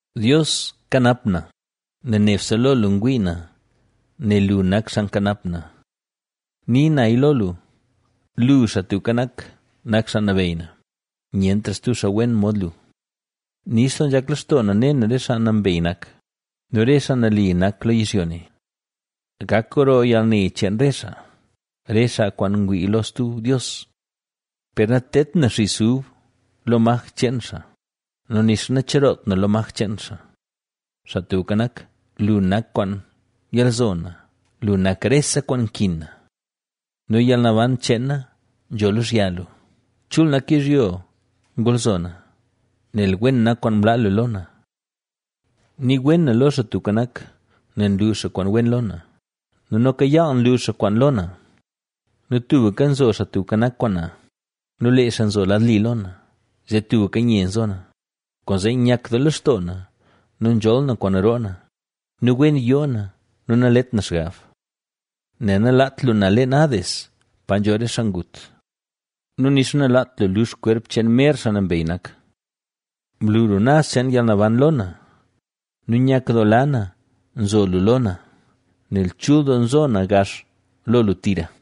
Dios, kanap na, nel nebse lo lu ngwii na nel lu nak xaa nkanap na. Ni naya lo lu: “Lu, Xaa Tubka Nak, nak Xaa Nabeyy na; nyentra stub xaa wen mod lu.” Nix doo nzhak lextoo na ne na re xaa nambey nak nu re xaa nali nak lo yizhyo ne. Gak gro yalne cheen re xaa, re xaa kwaan ngwii lo stub dios. Per natedt na xis ub lo maj cheen xaa nu nixa nacheroot na lo maj cheen xaa. Xaa Tubka Nak, lu nak kwaan yalzo na, lu nak rese kwaan nkin na. Nu yalnaban cheen na nzho lozhya lu. Chul nak yizhyo ngolzo na, nel wen nak kwaan mlaa lu lo na. Nii wen na lo Xaa Tubka Nak, nel nlu xaa kwaan wen lo na nu noka yaal nlu xaa kwaan lo na. Nu tubka nzo Xaa Tubka Nak kwaan na nu lee xaa nzo lad li lo na, zee tubka nye nzo na. Kwaanzee nyak doo lextoo na nu nzholl na kwaan roo na nu wen yoo na, nu nalet na xgab, nel nalaat lu na leen Hades, pa nzho re xaa ngut nu nixa nalaat lu lux kwerp cheen mer xaa nambey nak. Mlu lu naz cheen yalnaban lo na nu nyakdoola na nzo lu lo na, nel chul doo nzo na gax lo lu tira.